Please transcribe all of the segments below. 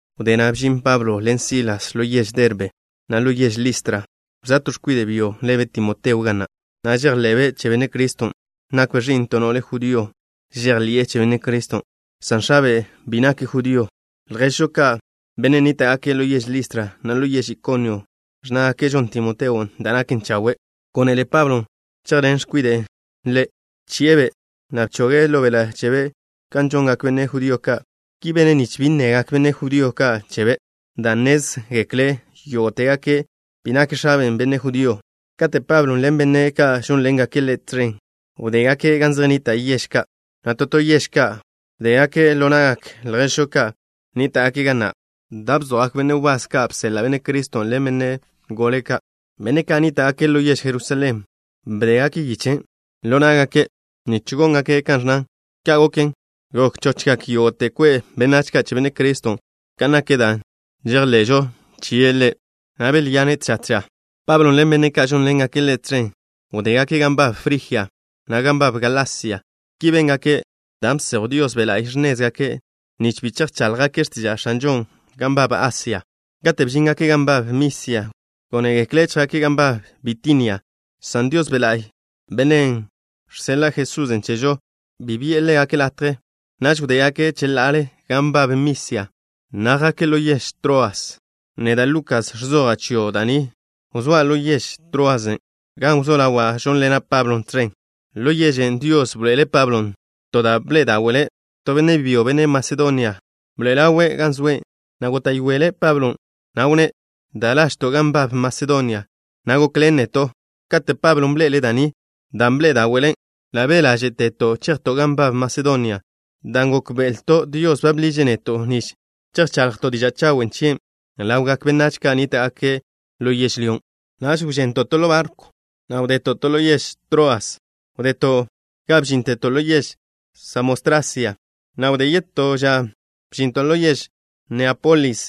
Wdé na' bžin Pablo ḻen Silas ḻo yež Derbe, na' ḻo yež Listra. Wzóa to x̱kwide' byo lebe' Timoteo ga na', na' žejḻe'be' che Benne' Criston'. Nakbe' ẕi'n to no'le judío žejḻi'e che Benne' Criston', san x̱abe' bi nake' judío. Lježžo ka', benne' nníta'gake' ḻo yež Listra, na' ḻo yež Ikonio ẕnnágake' žon Timoteon' da' naken chawe'. Gónele Pablon' chejḻen x̱kwiden' ḻe'. Bchi'e-be', na' bchoge' ḻo beḻa' chebe' kan žongak benne' judío ka'. Ki bene' nich bi nnegak benne' judío ka' chebe', dan' nnézgekle' yógo'tegake' bi nak x̱abe' benne' judío. Kate' Pablon' ḻen benne' ka' žónḻengake' ḻe' tẕen wdégake' gan zej nnita' yež ka', na' to to yež ka' bdégake' ḻo na'gak lježžo ka' nníta'gake' ga na' da' bzojgak benne' wbás ka' bseḻa' Benne' Criston' ḻen benne' gole ka', benne' ka' nníta'gake' ḻo yež Jerusalén. Bdégake' yichen' ḻo ná'gake' nich góngake' kan ẕnnan. Ka' goken, gok chochgak yógo'te kwe' benách ka' che Benne' Criston' kan nak da' žejḻe'žo chie' Ḻe', na' belyane' tža tža. Pablo ḻen benne' ka' žónḻengake' ḻe' tẕen wdégake' gan nbab Frijia, na' gan nbab Galasia. Ki béngake' dan' bsejw Dios Be' La'y x̱nézgake', nich bi chejcháḻjgake' x̱tiža' X̱anžon' gan nbab Asia. Kate' bžíngake' gan nbab Misia, gónegekle' chjake' gan nbab Bitinia, san Dios Be' La'y, Bennen' žseḻa' Jesusen' chežo, bi bi'e ḻégake' latje. Naž wdégake' cheḻa'ale gan nbab Misia, na' jake' ḻo yež Troas. Neda', Lukas, ẕzoja' chio' da' ni, wzóa' ḻo yež Troasen', gan wzó ḻawa' žónḻena' Pablon' tẕen. Ḻo yežen' Dios bḻoe'ele' Pablon' to da' bḻe'e dáwe'le'. To benne' byo, benne' Masedonia, bḻoe'e ḻawe' gan zoe', na' góta'yoele' Pablon', na' wnné': “Da lažto', gan nbab Masedonia, na' gokḻen neto'.” Kate' Pablon' bḻe'ele' da' ni, dan' bḻe'e dáwe'le', ḻa' be' ḻáže'teto' chejto' gan nbab Masedonia, dan' gókbe'elto' Dios ba bḻiže' neto' nich chejchaḻjto' diža' chawen' chie' ḻawgak benách ka' nníta'gake' ḻo yežlyón'. Naž wžento' to ḻo barkw, na' wza'to' ḻo yež Troas. Wdeto' ga bžínteto' ḻo yež Samotrasia, na' wdé yetó ža bžinto' ḻo yež Neápolis.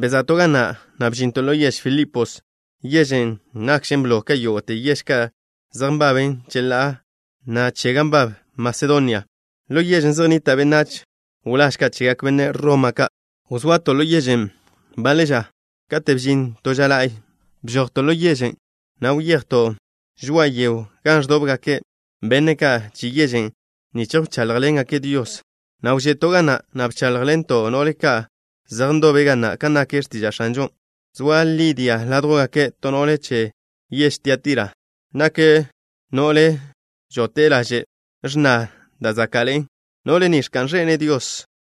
Beza'to' ga na', na' bžinto' ḻo yež Filipos, yežen' nakžen blo ka yógo'te yež ka' zej nbaben cheḻá'a na' che gan nbab Masedonia. Ḻo yežen' zej nnita' benách wláž ka' chegak benne' Roma ka'. Wzoato' ḻo yežen' baḻe ža. Kate' bžin to ža la'y, bžojto' ḻo yež, na' wyejto' žoa'a yego gan ẕdóbgakkze benne' ka' che yežen' nich wcháḻjḻengake' Dios, na' wže'to' ga na', na' bcháḻjḻento' no'le ka' zej ndobe' ga na', kan nak x̱tiža' X̱anžon'. Zoa Lidia ládjwgake', to no'le che yež Tiatira. Nake' no'le žóti'e laže' x̱na da' záka'ḻe'en. No'le ni ẕka'n ẕene' Dios,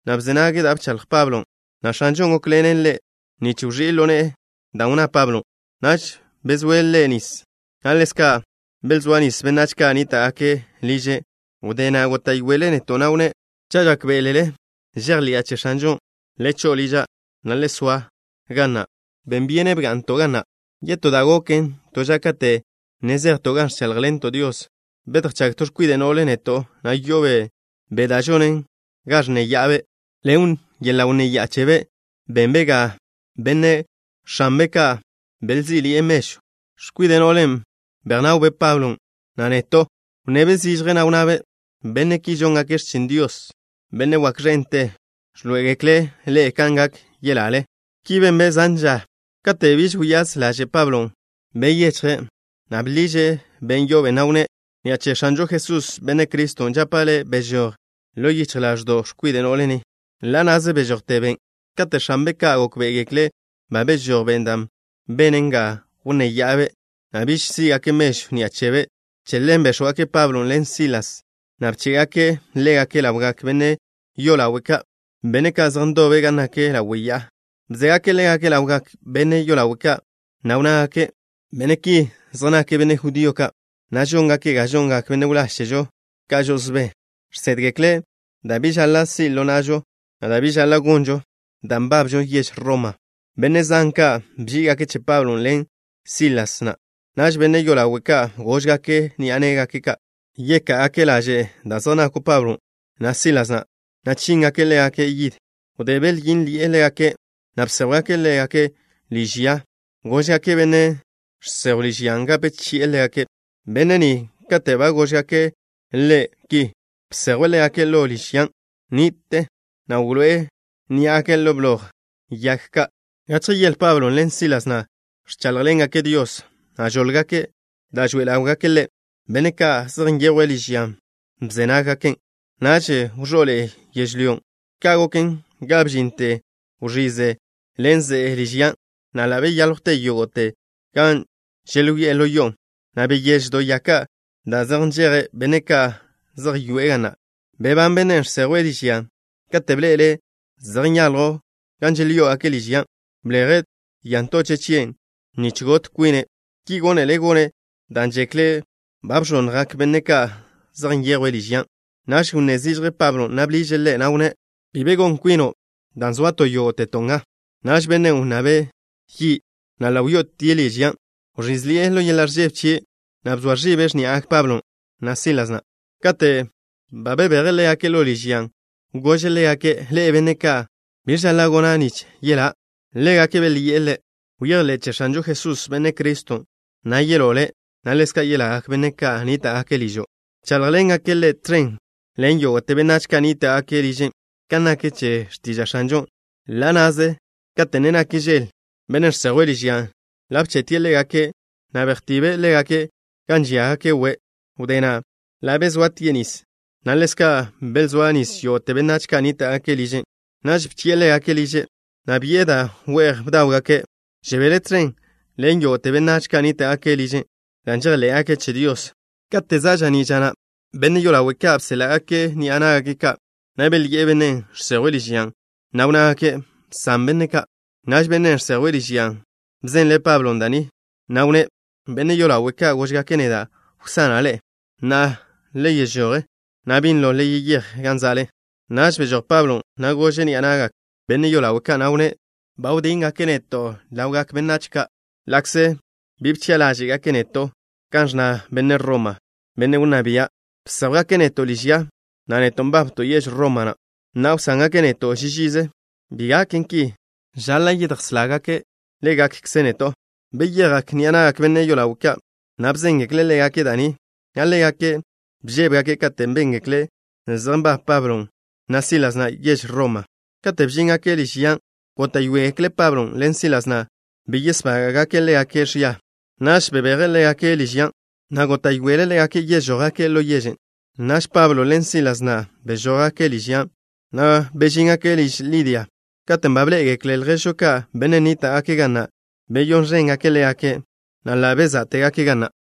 na' bze nage' da' bchaḻj Pablon', na' X̱anžon' gókḻene' no'len' nich wẕí' ḻo ne'e dan' wnná Pablon'. Naž bezóe' ḻe' nis, na' ḻezka' belzóa nis benách ka' nníta'gake' liže'. Wdé na' góta'yoele' neto', na' wnné': —Cha' žákbe'elele žejḻi'a che X̱anžon', le cho'o liža', na' le soa ga na'. Ben byene' bga'nto' ga na'. Yetó da' goken to ža kate' ne zejto' gan ẕcháḻjḻento' Dios, bedjchág to x̱kwide' no'le neto', na' yo'obe' be' da' žonen ga ẕnnéya'abe'. Ḻen yeḻa' wnnéya'a chebe' benbe' ga benne' x̱anbe' ka' belzí'ḻi'e mežw. X̱kwide' no'len' bejnawbe' Pablon', na' neto'. Wnnebe' zižje, na' wnnabe': —Benne' ki žóngake' x̱chin Dios, Benne' wak ẕente. Ẕḻoé'egekle' ḻe'e kan gak yelale. Ki benbe' zan ža. Katen' biž wyáz ḻaže' Pablon', byechje', na' bḻiže' ben' yo'obe', na' wnné': —Ni'a che X̱anžo Jesús, Benne' Criston', žapa' le': bežój ḻo yichj ḻáẕdo'w x̱kwide' no'le ni. Ḻa' na'ze bežojte ben'. Kate' x̱anbe' ka' gókbe'egekle' ba bežój ben' da' benen ga wnnéya'abe', na' biž sí'gake' mežw ni'a chebe', che ḻen béx̱wgake' Pablon' ḻen Silas, na' bché'gake' ḻégake' ḻawgak benne' yolawe' ka', benne' ka' zej ndobe' gan nak ḻawe' ya'a. Bzégake' ḻégake' ḻawgak benne' yolawe' ka', na' wnnágake': —Benne' ki zej nake' benne' judío ka', na' žóngake' ga žongak benne' wláž chežo ka' žo'osbé. Žsédgekle' da' bi žaḻa' si' ḻo na'žo, na' da' bi žaḻa' gonžon, dan' nbabžo yež Roma. Benne' zan ka' bží'igake' che Pablon' ḻen Sílasen'. Naž benne' yolawe' ka' góžgake' ni'a ná'gake' ka' yeká'gake' laže' da' zej nakw Pablon', na' Sílasen', na' chíngake' ḻégake' yid. Wdé belyínḻi'e ḻégake', na' bséjwgake' ḻégake' liž ya. Góžgake' benne' žsejwe' liž yan' gape chi'e ḻégake'. Benne' ni, kate' ba góžgake' ḻe' ki, bsejwe' ḻégake' ḻo liž yan' ni'te, na' wḻoé'e ní'agake' ḻo bloj yag ka'. Gachje yele Pablon' ḻen Sílasen' ẕcháḻjḻengake' Dios, na' žóḻgake' da' žoe ḻáwgake' Ḻe'. Benne' ka' zej nyejwe' liž yan' bze nággaken'. Naž wẕó'ḻe'e yežlyó. Ka' goken ga bžinte wẕize ḻen ze'e liž yan', na' ḻa' belyáljwte yógo'te gan želyoé'e ḻo yo'on', na' beyéž do ya ka' da' zej nžejen benne' ka' zej yoe'e ga na'. Bebán bennen' žsejwe' liž yan'. Kate' bḻe'ele' zej nyaljw gan želyoé'e liž yan', bleje' ya ntoche' chie' nich got kwine'. Ki gónele' gone' dan' žekle' ba bẕonnjgak benne' ka' zej nyejwe' liž yan'. Naž wnné zižje Pablon', na' bḻiže' ḻe', na' wnné': —Bi be gon kwino', dan' zoato' yógo'teto' nga. Naž bennen' wnnabe' yi', na' ḻa' wyo'otie' liž yan'. Wẕízḻi'e ḻo yeḻa' ẕžebe chie', na' bzoa ẕibe' x̱ní'agak Pablon', na' Sílasen'. Kate' ba bebeje' ḻégake' ḻo liž yan', gože' ḻégake': —Ḻe'e, benne' ka', ¿biẕ žaḻa' gona' nich yelá'? Ḻégake' belyi'e ḻe': —Bejḻé' che X̱anžo Jesús, Benne' Criston', na' yeló' le', na' ḻezka' yelagak benách ka' nníta'gake' ližo'. Bcháḻjḻengake' ḻe' tẕen ḻen yógo'te benách ka' nníta'gake' liže', kan nak che x̱tiža' X̱anžon'. Ḻa' na'ze, kate' ne nak žel, bennen' žsejwe' liž yan' ḻa' bche'tie' ḻégake', na' bejtibe' ḻégake' gan ẕíagake' we'. Wdé na', ḻa' bezoatie' nis, na' ḻezka' belzóa nis yógo'te benách ka' nníta'gake' liže'. Naž bchi'e ḻégake' liže', na' bi'e da' we'j bdáwgake'. Žebele' tẕen ḻen yógo'te benách ka' nníta'gake' liže' dan' žejḻé'gake' che Dios. Kate' za' ža'ní' ža na', benne' yolawe' ka' bséḻa'gake' ni'a ná'gake', na' belyi'e bennen' žsejwe' liž yan', na' wnnágake': —Bsan benne' ka'. Naž bennen' žsejwe' liž yan' bzenle' Pablo da' ni, na' wnné': —Benne' yolawe' ka' góžgake' neda' wsana' ḻe'e. Na'a, le žoj, na' binlo le yeyéj gan zoale. Naž bžoj Pablon', na' gože' ni'a na'gak benne' yolawe' ka', na' wnné': —Ba wdíngake' neto' ḻawgak benách ka' ḻa'kze bi bchi'a ḻáže'gake' neto' kan ẕnna benne' Roma, benne' wnná bia'. Bséjwgake' neto' liž ya, na' neto' nbabto' yež Roma na'. ¿Na'a wsángake' neto' ži žize? ¡Bi gaken ki! Žaḻa' yedjsángake' ḻégakkze' neto'. Beyejgak ni'a na'gak benne' yolawe' ka', na' bzéngekle' ḻégake' da' ni, na' ḻégake' bžébegake' kate' béngekle' zej nbab Pablon', na' Sílasen' yež Roma. Kate' bžíngake' liž yan', góta'yoegekle' Pablon' ḻen Sílasen' bi yesbága'gake' ḻégake' ẕia. Naž belbeje' ḻégake' liž yan', na' góta'yoegekle' ḻégake' žójgake' ḻo yežen'. Naž Pablon' ḻen Sílasen' bžójgake' liž yan', na' wyó'ogake' liž Lidia. Katen' ba bḻé'egekle' lježžo ka', benne' nníta'gake' ga na', beyón ẕéngake' ḻégake', na' ḻa' bezá'tegake' ga na'.